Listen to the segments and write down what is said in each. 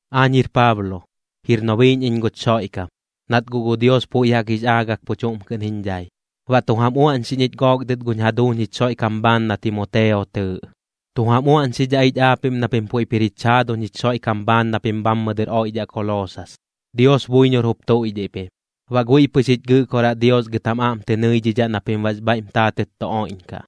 Aañ jir Paablo, jir nobiiꞌñ iñ guch Xoiꞌkam, nat guꞌ gu Dios puiꞌ jaꞌk jix aagak pu chuꞌm kɨꞌn jiñ dhai. Baꞌ tu jam uaꞌñxiꞌñ ich gook dɨt guñ jaduuñ jich Xoiꞌkam bhaan na Timoteo tɨɨꞌ. Tu jam uaꞌñxidhaꞌ ich aapiꞌm na pim puiꞌp jir jich jaaduñ jich Xoiꞌkam bhaan na pim bhammɨ dɨr oiꞌdhaꞌ Koloosas, Dios buiñor jup tuiꞌdhiꞌ pim. Baꞌ guiꞌ pɨx jich Gɨꞌkoraꞌ Dios gɨt jam aꞌm tɨ nɨidhidhaꞌ na pim baꞌx bhaiꞌm taatɨt tu oiꞌñkaꞌ.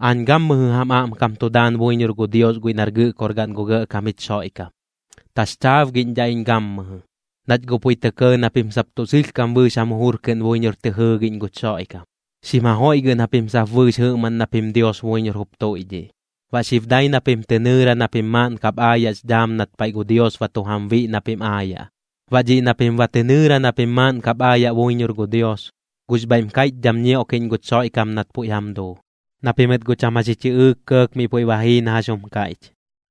Aañ gammɨjɨ jam aꞌmkam tu daan buiñor gu Dios guiꞌ nar Gɨꞌkorgaꞌn gu Gɇꞌkam jich Xoiꞌkam, taxchaabgiꞌñdhaꞌ iñ gammɨjɨ, nach guꞌ puiꞌ tɇ kɇɇ na pim sap tuꞌ sɨlhkam bɨɨx jam jujur kɨꞌn buiñor tɨ jɨɨgiꞌñ guch Xoiꞌkam, xim jajoiꞌgɨꞌn japim sap bɨɨx jɨꞌmaꞌn na pim Dios buiñor jup tuiꞌdhiꞌ. Baꞌ xib dai na pim tɨ nɨɨra na pim maaꞌn kap aayaꞌx dhaam nat paiꞌ gu Dios ba tu jam biꞌ na pim aayaꞌ. Baꞌ dhiꞌ na pim ba tɨ nɨɨra na pim maaꞌn kap aayaꞌ buiñor gu Dios, gux bhaiꞌm kaiꞌchdham ñioꞌkiꞌñ guch Xoiꞌkam nat puiꞌ jam duu, na pimɨt guꞌ cham jax ji chɨꞌɨɨk kɇɇk miꞌ puiꞌ ba jii na jax jum kaiꞌch,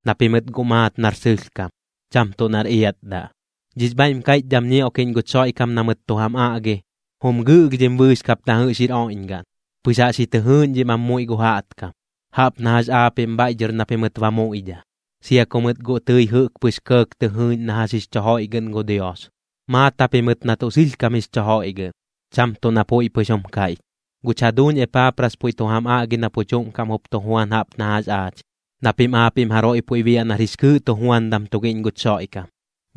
na pimɨt guꞌ maat nar sɨlhkam, cham tuꞌ nar iatdaꞌ. Dhix bhaiꞌm kaiꞌchdham ñioꞌkiꞌñ guch Xoiꞌkam na mɨt tu jam aꞌgi, jum gɨꞌlhdhim bɨɨx kap na jɨꞌx oiꞌñgaꞌn, pɨx jaꞌx ji tɨ jɨɨꞌñdhim am muiꞌ gu jaꞌtkam, jaꞌp na jax aapiꞌm bhaiꞌ dhɨr na pimɨt ba muiꞌdha, sia ku mɨt guꞌ tɨi jɨꞌk pɨx kɇɇk tɨ jɨɨꞌñ na jax jix chu joiꞌgɨꞌn gu Dios, maat japimɨt na tuꞌ sɨlhkam jix chu joiꞌgɨꞌn, cham tuꞌ na puiꞌ pɨx jum kaiꞌch. Guch jaduuñ Epaapras puiꞌ tu jam aꞌgi na pu chuꞌm kaꞌm jup tu juan jaꞌp na jax aach, na pim aapiꞌm jaroiꞌ puiꞌ biaꞌ nar jix kɨɨꞌ tujuandam tugiꞌñ guch Xoiꞌkam.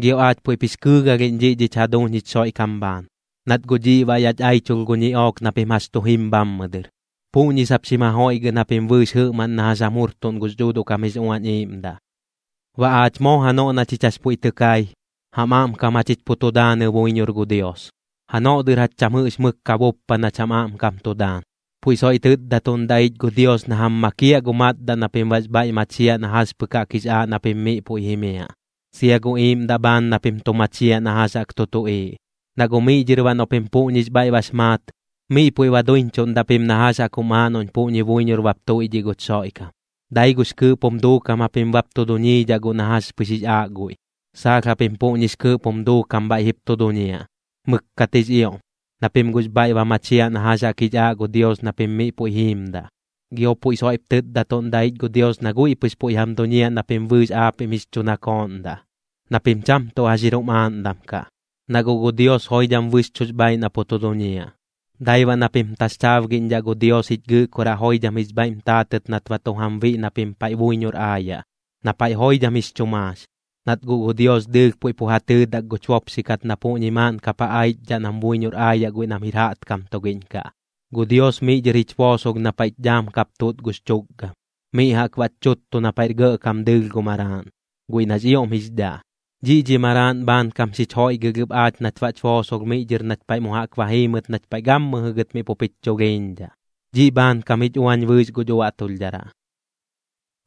Gio aach puiꞌp jix kɨɨgalhiꞌñ dhiꞌ dhich jaduuñ jich Xoiꞌkam bhaan, nat guꞌ dhiꞌ baꞌ yach aichulh gu ñiꞌook na pim jax tu jim bhammɨ dɨr, puꞌñi sap xim ja joiꞌgɨꞌn japim bɨɨx jɨꞌmaꞌn na jax jam jurtuꞌn gux Dhuuduꞌ kam jix Uañ Iiꞌmdaꞌ. Baꞌ aach moo janoꞌ na chich jax puiꞌ tɨ kai, jam aꞌmkam jachich pu tu daanɨ buiñor gu Dios, janoꞌ dɨr jach cham jɨꞌx mɨk ka buppa nach jam aꞌmkam tu daan. Puiꞌ soiꞌ tɨtdatuꞌndaꞌ ich gu Dios na jam makiaꞌ gu matdaꞌ na pim baꞌx bhaiꞌ machiaꞌ na jax pɨk jaꞌk jix aaꞌ na pim miꞌ puiꞌ jimiaꞌ, sia gu iiꞌmdaꞌ bhaan na pim tu machiaꞌ na jax jaꞌk tu tuꞌiiꞌ. Na guꞌ miꞌ dhɨr baꞌ noꞌ pim puꞌñix bhaiꞌ bax maat, miꞌ puiꞌ ba duiñchuꞌndaꞌ pim na jax jaꞌk jum aaꞌ noꞌñ puꞌñi buiñor bap tuiꞌdhiꞌ guch Xoiꞌkam, dai gux kɨɨꞌp jum duukam japim bap tu duñiidhaꞌ guꞌ na jax pɨx jix aaꞌ guiꞌ. Saalh japim puꞌñix kɨɨꞌp jum duukam bhaiꞌ jip tu duñiaꞌ, mɨkkat jix ioꞌm, na pim guꞌx bhaiꞌ ba machiaꞌ na jax jaꞌk jix aaꞌ gu Dios na pim miꞌ puiꞌ jiimdaꞌ. Gio puiꞌ soiꞌp tɨtdatuꞌndaꞌ ich gu Dios na guiꞌ pɨx puiꞌ jam duñiaꞌ na pim bɨɨx aapiꞌm jix chu nakooꞌndaꞌ, na pim cham tuꞌ jax jir jum aaꞌndam kaꞌ, na guꞌ gu Dios joidham bɨxchuꞌx bhaaiꞌ na pu tu duñiaꞌ. Dai baꞌ na pim taxchaabgiꞌñdhaꞌ gu Dios jich Gɨꞌkoraꞌ joidham jix bhaiꞌm taatɨt nat ba tu jam biꞌ na pim paiꞌ buiñor aayaꞌ, na paiꞌ joidham jix chu maax, nat guꞌ gu Dios dɨɨlh puiꞌ pu ja tɨɨdak guch bopxi kat na puꞌñi maaꞌn kap ja aichdhaꞌ nam buiñor aayaꞌ guiꞌ nam jir jaꞌtkam tugiꞌñ kaꞌ. Gu Dios miꞌ dhɨr jich boosolh na paiꞌch dhaam kap tuꞌt gux chukgam, miꞌ jaꞌk baꞌch chuttu na paiꞌr gɇꞌkam gu dɨɨlh Maraaꞌn, guiꞌ nax ioꞌm jix dhaꞌ. Dhiꞌ dhi Maraaꞌn bhaankam xich joiꞌgɨlh ɨp aach nat baꞌch boosolh miꞌ dhɨr nach paiꞌ mu jaꞌk ba jiimɨt nach paiꞌ gammɨjɨ gɨt miꞌ pup jich chulhiiñdhaꞌ, dhiꞌ bhaankam jich uañ bɨɨx guch uaꞌtulhdharaꞌ.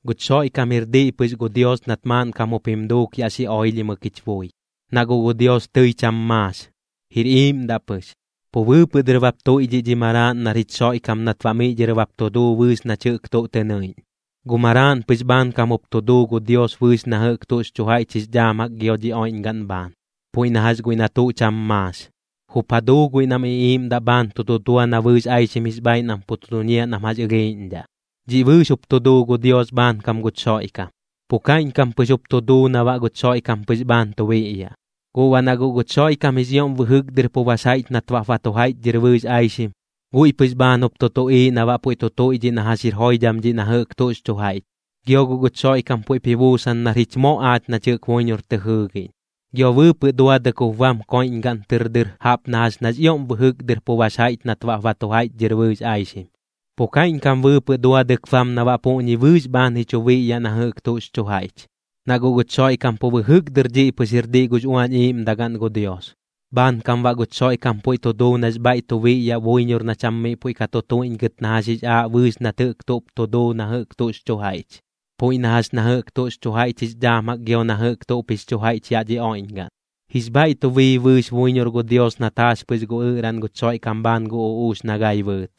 Guch Xoiꞌkam jir diꞌ pɨx gu Dios nat maaꞌnkam jup jim duuk yaꞌ xi oilhimɨk jich bui. Na guꞌ gu Dios tɨi cham maax, jir iiꞌmdaꞌ pɨx. Pu bɨɨpɨꞌ dɨr bap tuiꞌdhiꞌ dhi Maraaꞌn nar jich Xoiꞌkam nat baꞌ miꞌ dhɨr bap tu duu bɨɨx nach jɨꞌk tuꞌ tɨ nɨiꞌñ. Gu Maraaꞌn pɨx bhaankam jup tu duu gu Dios bɨɨx na jɨꞌk tuꞌx chu jaiꞌch jix dhaam jaꞌk gio dhi oiꞌñgaꞌn bhaan, puiꞌ na jax guiꞌ na tuꞌ cham maax. Jup ja duu guiꞌ nam iꞌiiꞌmdaꞌ bhaan tu dudua na bɨɨx aixim jix bhaaiꞌ nam pu tu duñiaꞌ nam jax ɨlhiiꞌñdhaꞌ. Dhiꞌ bɨɨx jup tu duu gu Dios bhaankam guch Xoiꞌkam, pu kaiꞌñkam pɨx jup tu duu na baꞌ guch Xoiꞌkam pɨx bhaan tu biꞌyaꞌ. Guꞌ baꞌ na guꞌ guch Xoiꞌkam jix ioꞌm bɨjɨk dɨr pu bax jaiꞌch nat baꞌp ba tu jaiꞌchdhɨr bɨɨx aixim, guiꞌ pɨx bhaan jup tu tuꞌiiꞌ na baꞌ puiꞌ tu tuiꞌdhiꞌ na jax jir joidham dhiꞌ na jɨꞌk tuꞌx chu jaiꞌch. Gio guꞌ guch Xoiꞌkam puiꞌp ji buusan nar jich moꞌ aach nach jɨꞌk buiñor tɨ jɨɨgiꞌñ. Gio bɨɨpɨꞌ duadɨk jup bam koiꞌñgaꞌn tɨr dɨr jaꞌp na jax nax ioꞌm bɨjɨk dɨr pu bax jaiꞌch nat baꞌp ba tu jaiꞌchdhɨr bɨɨx aixim, pu kaiꞌñkam bɨɨpɨꞌ duadɨk bam na baꞌ puꞌñi bɨɨx bhaan ji chu biꞌyaꞌ na jɨꞌx tuꞌx chu jaiꞌch. Na guꞌ guch Xoiꞌkam pu bɨjɨk dɨr dhiꞌ pɨx jir diꞌ gux Uañ Iiꞌmdagaꞌn gu Dios, bhaankam baꞌ guch Xoiꞌkam puiꞌ tu duu nax bhaiꞌ tu biꞌyaꞌ buiñor na cham miꞌ puiꞌ ka tu tuiꞌñgɨt na jax jix aaꞌ bɨɨx nat jɨꞌk tuꞌp tu duu na jɨꞌk tuꞌx chu jaiꞌch, puiꞌ na jax na jɨꞌk tuꞌx chu jaiꞌch jix dhaam jaꞌk gio na jɨꞌk tuꞌp jix chu jaiꞌch yaꞌ dhi oiꞌñgaꞌn. Jix bhaiꞌ tu bii bɨɨx buiñor gu Dios nat jaax pɨx gu ɨꞌraꞌn guch Xoiꞌkam bhaan gu uꞌuux na gai bɨɨt.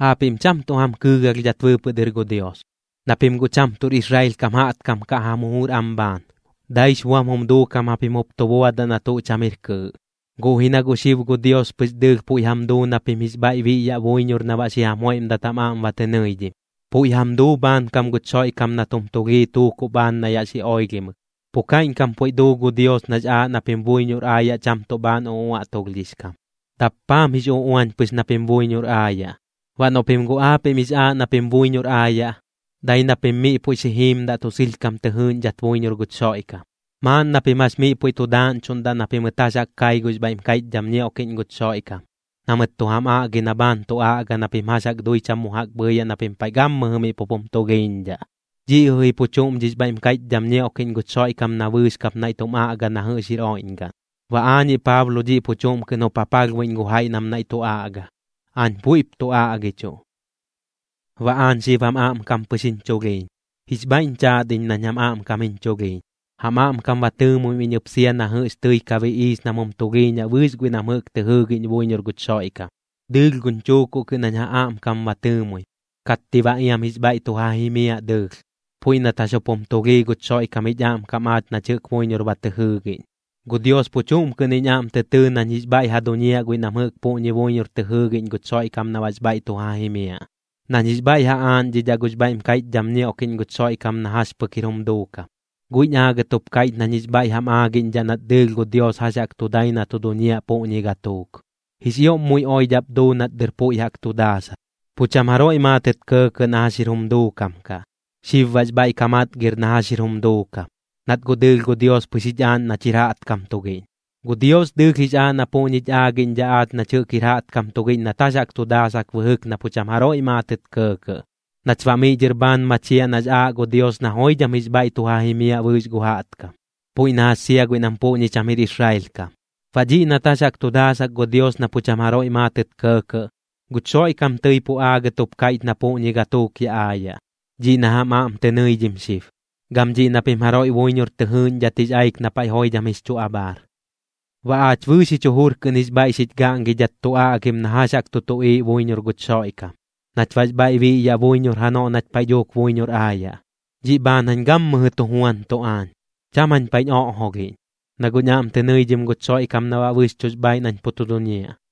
Aapiꞌm cham tuꞌ jam kɨɨgalhdhat bɨɨpɨꞌ dɨr gu Dios, na pim guꞌ cham tuꞌr Israel kam jaꞌtkam kaꞌ jam jujur am bhaan, daix buam jum duukam japim jup tu buadaꞌ na tuꞌ cham jir kɨɨꞌ. Guꞌ ji na guꞌ xib gu Dios pɨx dɨɨlh puiꞌ jam duu na pim jix bhaiꞌ biꞌyaꞌ buiñor na baꞌ xi jam joiꞌmdat jam aꞌm ba tɨ nɨidhim, puiꞌ jam duu bhaankam guch Xoiꞌkam nat jum tulhii tuukuꞌ bhaan na yaꞌ xi oilhimɨk. Pu kaiꞌñkam puiꞌ duu gu Dios nax aaꞌ na pim buiñor aayaꞌ cham tuꞌ bhaan uꞌuaꞌtulhdhix kam, dappaam jix uꞌuañ pɨx na pim buiñor aayaꞌ. Baꞌ noꞌ pim guꞌ aapiꞌm jix aaꞌ na pim buiñor aayaꞌ, dai na pim miꞌ puiꞌ xi jiimdaꞌ tuꞌ sɨlhkam tɨ jɨɨꞌñdhat buiñor guch Xoiꞌkam, maaꞌn na pim jax miꞌ puiꞌ tu daaꞌñchuꞌndaꞌ na pimɨt jax jaꞌk kai gux bhaiꞌm kaiꞌchdham ñioꞌkiꞌñ guch Xoiꞌkam, na mɨt tu jam aꞌgi na bhaan tu aꞌga na pim jax jaꞌk dui cham mu jaꞌk bhɨɨyaꞌ na pim paiꞌ gammɨjɨ miꞌ pup jum tulhiiñdhaꞌ. Dhiꞌ jɨꞌ ji pu chuꞌm dhix bhaiꞌm kaiꞌchdham ñioꞌkiꞌñ guch Xoiꞌkam na bɨɨx kap naiꞌ tum aꞌga na jɨꞌx jir oiꞌñgaꞌn. Baꞌ aañiꞌ Paablo dhiꞌ pu chuꞌm kɨꞌn jup ja palhbuiꞌñ gu jaiꞌ nam naiꞌ tu aꞌga, aañ puiꞌp tu aꞌgichuꞌ. Baꞌ aañ xib jam aꞌmkam pɨx jiñ chulhiiñ. Jix bhaiꞌñ chaat iñ nañ jam aꞌmkam jiñ chulhiiñ, jam aꞌmkam ba tɨɨmuim iñ ɨp sia na jɨꞌx tɨi ka biꞌiix nam jum tulhiiñaꞌ bɨɨx guiꞌ nam jɨꞌk tɨ jɨɨgiꞌñ buiñor guch Xoiꞌkam. Dɨɨlh guñ chuukuꞌ kɨꞌn jañ ja aꞌmkam ba tɨɨmuim, katti baꞌ iam jix bhaiꞌ tu ja jimiaꞌ dɨɨlh, puiꞌ nat jax jup jum tulhii guch Xoiꞌkam jich aꞌmkam aach nach jɨꞌk buiñor ba tɨ jɨɨgiꞌñ. Gu Dios pu chuꞌm kɨꞌn jiñ aꞌm tɨ tɨɨ nañ jix bhaiꞌ ja duñiaꞌ guiꞌ nam jɨꞌk puꞌñi buiñor tɨ jɨɨgiꞌñ guch Xoiꞌkam na baꞌx bhaiꞌ tu ja jimiaꞌ, nañ jix bhaiꞌ ja aaꞌñdhidhaꞌ gux bhaiꞌm kaiꞌchdham ñioꞌkiꞌñ guch Xoiꞌkam na jax pɨk jir jum duukam. Guiꞌñ aagɨt jup kaiꞌch nañ jix bhaiꞌ jam aagiꞌñdhaꞌ nat dɨɨlh gu Dios jax jaꞌk tu dai na tu duñiaꞌ puꞌñi gatuuk. Jix ioꞌm muiꞌ oidhaꞌp duu nat dɨr puiꞌ jaꞌk tu daasak, pu cham jaroiꞌ maatɨt kɇɇkɇꞌ na jax jir jum duukam kaꞌ. Xib baꞌx bhaiꞌ ka matgir na jax jir jum duukam, nat guꞌ dɨɨlh gu Dios pɨx jich aaꞌñ nach jɨꞌk jir jaꞌtkam tugiꞌñ. Gu Dios dɨɨlh jix aa na puꞌñich aagiꞌñdhaꞌ aach nach jɨꞌk jir jaꞌtkam tugiꞌñ nat jax jaꞌk tu daasak bɨjɨk na pu cham jaroiꞌ maatɨt kɇɇkɇꞌ, nach baꞌ miꞌ dhɨr bhaan machiaꞌ nax aaꞌ gu Dios na joidham jix bhaiꞌ tu ja jimiaꞌ bɨɨx gu jaꞌtkam, puiꞌ na jax sia guiꞌ nam puꞌñi cham jir Israel kam. Baꞌ dhiꞌ nat jax jaꞌk tu daasak gu Dios na pu cham jaroiꞌ maatɨt kɇɇkɇꞌ, guch Xoiꞌkam tɨi pu aagɨt jup kaiꞌch na puꞌñi gatuuk yaꞌ aayaꞌ, dhiꞌ na jam aꞌm tɨ nɨidhim xib, gam dhiꞌ na pim jaroiꞌ buiñor tɨ jɨɨꞌñdhat jix aik na paiꞌ joidham jix chu abhaar. Baꞌ aach bɨɨx jich jujur kɨꞌn jix bhaiꞌ xich gaꞌngidhat tu aꞌgim na jax jaꞌk tu tuꞌiiꞌ buiñor guch Xoiꞌkam, nach baꞌx bhaiꞌ biꞌyaꞌ buiñor janoꞌ nach paiꞌ dhuuk buiñor aayaꞌ. Dhiꞌ bhaan jañ gammɨjɨ tu juantuꞌ aañ, cham jañ paiꞌñ oꞌjolhiꞌñ, na guꞌñ aꞌm tɨ nɨidhim guch Xoiꞌkam na baꞌ bɨxchuꞌx bhaaiꞌ nañ pu tu duñiaꞌ.